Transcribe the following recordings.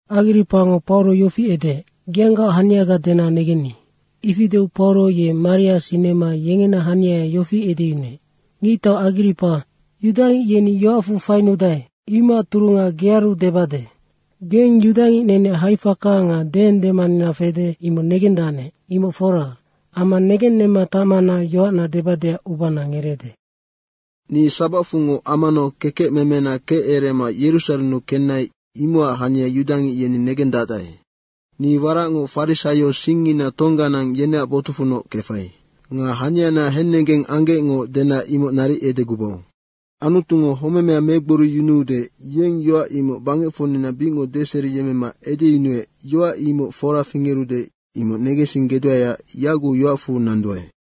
Agripango Pauro yofi edeec, “Geanggaoc haniaga dena negenni.” Ifi deu Pauro ye maria sinema yengena haniaya yofi edeyunuec, “Ngictau Agripa, yudangic yeni yoacfu fainudae, imocac turunga gearu debade. Geng yudangic neneac haifaka nga deendemanina fede, imoc negendacnec, imoc fora, amma negennemma tacmana yoacna debadeac ubana ngereede. Ni sabacfungoc amanau kekecmemena kecerema Yerusarennu kenai, imocac hania yudangic yeni negendacdae. Ni waracngoc farisaio singngina tongganang yeneac botucfunoc kefai. Nga haniana hennegeng anggecngo dena imoc naric edegubau. Anutungo homemea megboriyunuude, yeng yoac imoc bangecfocnina bicngoc deseriyemmema edeyunuec, yoac imoc fora fingerude, imoc negensinggeduaeac yaguc yoacfu nanduae.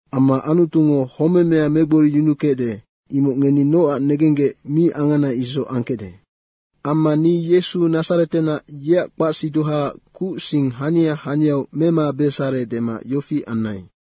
Amma Anutungo homemea megboriyunukecde, imoc ngeni nocac negenggec mi angana isoc angkecde. Amma ni Yesu Nadzaretenac, yeac kpacsiduhaac kuc sing hania haniau memabesare dema yofi anai.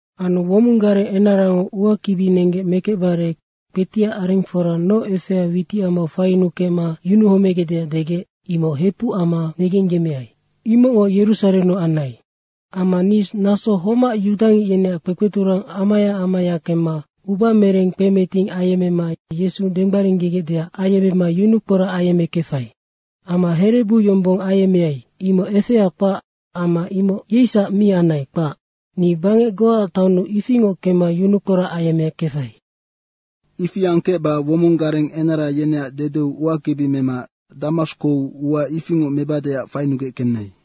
Anu womong gareng enarango uakibi nenggec mekecbare kpetiac arengfora noc efea witicamau faiyunukecma yunuhomegecdeac degec, imoc hepuc amma negengyemmeai. Imocngoc Yerusarennu anai. Amma ni naso homac yudangic yeneac kpekpeturang amaya amaya kemma ubamereng kpemeting ayemmema Yesu denggbaringgegecdeac ayemmema yunukporac ayemmekefai. Amma herebu yombong ayemmeai, imoc efea kpac amma imoc yeisac mi anai, kpac. Ni bangec goaac taonnu ifingoc kemma yunukporac ayemmekefai. Ifi angkecba womong gareng enara yeneac dedeu uakibi mema Damaskou ua ifingoc mebadeac fainugec kenai.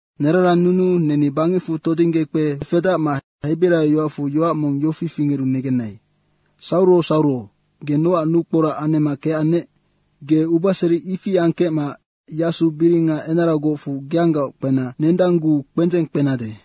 Nerarannunuu neni bangecfu todingge kpefedacma hebiraio yoacfu yoac mong yofi fingeru negenai, ‘Sauro Sauro, ge nocac nukporac anemma kecannec? Ge ubaseri ifi angkecma yasu biringa enaragocfu geanggaoc kpena nendangguu kpendzeng kpenade.’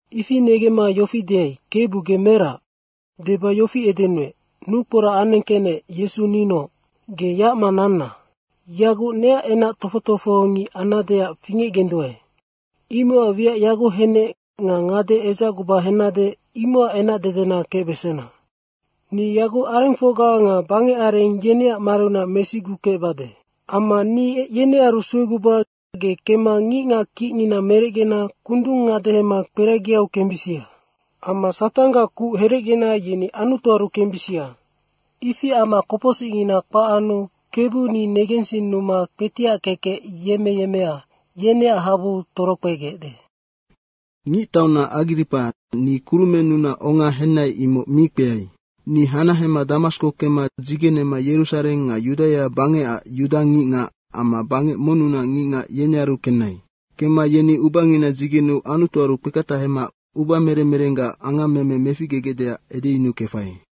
Ifi negemma yofi deai, ‘Kebu ge merac?’ deba yofi edenuec, ‘Nukporac anengkecnec, Yesu ninoc. Ge yacma nanna. Yaguc neac enac tofoc tofohongic annadeac fingecgenduae. Imocac wiac yaguc hennec nga ngade edzacguba hennade, imocac enacdedena kecbesena. Ni yaguc arengfocga nga bangecareng, yeneac mariunac mesigukecbade. Amma ni yenearu sueguba ge kemma ngicngac kicngina merecgena kundung ngadehema kperagiu kembisia. Amma Satanggac kuc herecgena yeni Anutuaru kembisia. Ifi amma kopocsicngina kpac anu Kebu ni negensinnuma kpetiac kekec yemmeyemmea, yeneac habuu torokpegecde.’ Ngictauna Agripa, ni kurumennunac onga henai, imoc mi kpeai. Ni hanahema Damasko kemma dzigenema Yerusareng nga Yudaia bangecac yuda ngicngac amma bangec monnunac ngicngac, yenearu kenai. Kemma yeni ubangina dzigeneu Anutuaru kpeketahema ubamerem merenggac angammeme meficgegecdeac edeyunukefai.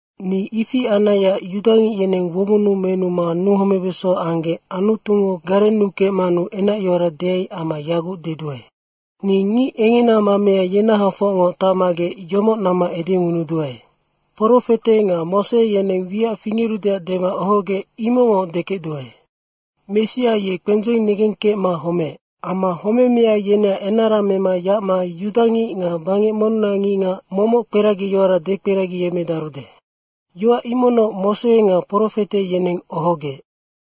Ni ifi anaiac yudangic yeneng womonnu menuma nuhomebeso anggec Anutungo garennukecmanu enacyoara deai amma yaguc deduae. Ni ngic engena mamea ngenahafocngoc tacmagec yomoc namma edengunuduae. Profete nga Mose yeneng wiac fingerudeac dema ohogec, imocngoc dekecduae. Messia ye kpendzeng negengkecma homeec. Amma homemea yeneac enara mema yacma yudangic nga bangec monnunac ngicngac momoc kperagiyoara dekperagiyemmedarude. Yoac imocnoc Mose nga profete yeneng ohogec.”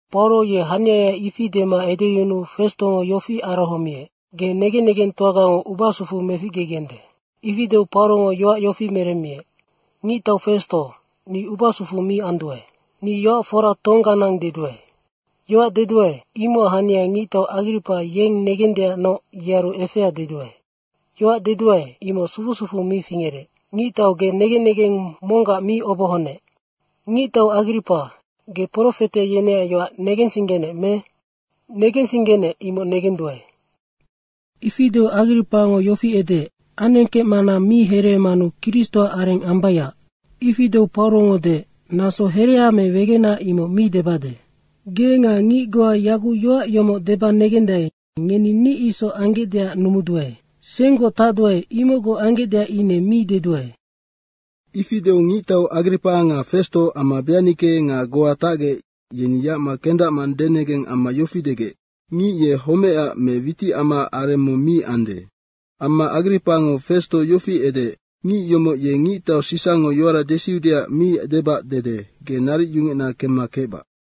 Pauro ye haniaya ifi dema edeyunuu Festongo yofi arohomiec, “Ge negen negengtoagango ubasufu meficgegende.” Ifi deu Paurongo yoac yofi meremmiec, “Ngictau Festo, ni ubasufu mi anduae. Ni yoac fora tongganang deduae. Yoac deduae, imocac hania ngictau Agripa yeng negendeacnoc yearu efea deduae. Yoac deduae, imoc sufu sufu mi fingerec. Ngictau ge negen negeng monggac mi obohonec. Ngictau Agripa, ge profete yeneac yoac negensinggenec me? Negensinggenec, imoc negenduae.” Ifi deu Agripango yofi edeec, “Anengkecmana mi hereemanu Kristoac areng ambaiac.” Ifi deu Paurongo deec, “Naso herea me wegena, imoc mi debade. Ge nga ngic goa yaguc yoac yomoc deba negendae, ngeni ni isoc anggecdeac numuduae. Senggoc tacduae, imocgoc anggecdeac ine mi deduae.” Ifi deu ngictau Agripa nga Festo amma Beanike nga goa tagec yeni yacma kendacma denegeng amma yofi degec, “Ngic ye homecac me witicamaac areng mong mi ande.” Amma Agripango Festo yofi edeec, “Ngic yomoc ye ngictau Sisango yoara desiudeac mi debac dede, ge naric yungecna kemma kecbac.”